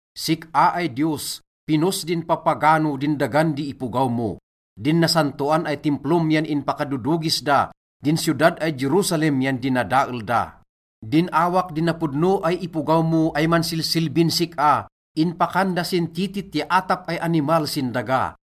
Sik-a ay Diyos, pinnos din papagano din dagan di ipogaw mo. Din nasantoan ay Timplom yan inpakadodogis da, din siyodad ay Jerusalem yan dinadael da. Din awak di napodno ay ipogaw mo ay mansilsilbin sik-a, inpakan da sin titit ya atap ay animal sin daga.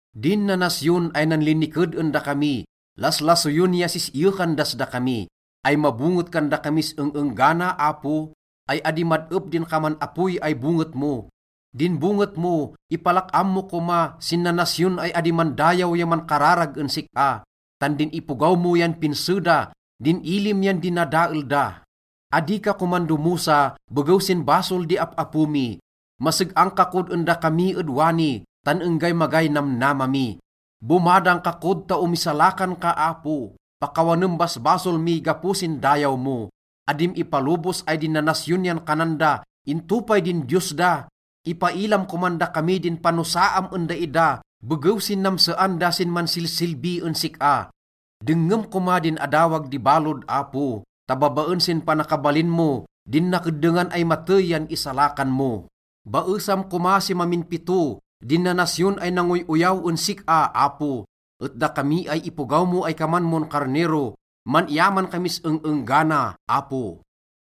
Din nanasyon ay nanliniked en dakami, laslasoyen ya sis-iyekan das dakami. Ay mabonget kan dakamis eng-enggana, Apo? Ay adi mad-ep din kaman apoy ay bonget mo? Din bonget mo, ipalak-am mo koma sin nanasyon ay adi mandayaw ya mankararag en sik-a. Tan din ipogaw mo yan pinse da, din ilim yan dinadael da. Adi ka koman domosa begew sin basol di ap-apo mi. Maseg-ang ka kod en dakami ed wani, tan enggay magay namnama mi. Bomadang ka kod ta omisalakan ka, Apo, pakawanem basbasol mi gapo sin dayaw mo. Adim ipalobos ay din nanasyon yan kanan da, “Into pay din Diyos da?” Ipailam koman dakami din panosaam en daida begew sin namsean da sin mansilsilbi en sik-a. Dengngem koma din adawag di balod, Apo, ta babaen sin panakabalin mo, din nakeddengan ay matey yan isalakan mo. Baesam koma si mamin pito din nanasyon ay nangoy-oyaw en sik-a, Apo. Et dakami ay ipogaw mo ay kaman mon karnero, man-iyaman kamis eng-enggana, Apo.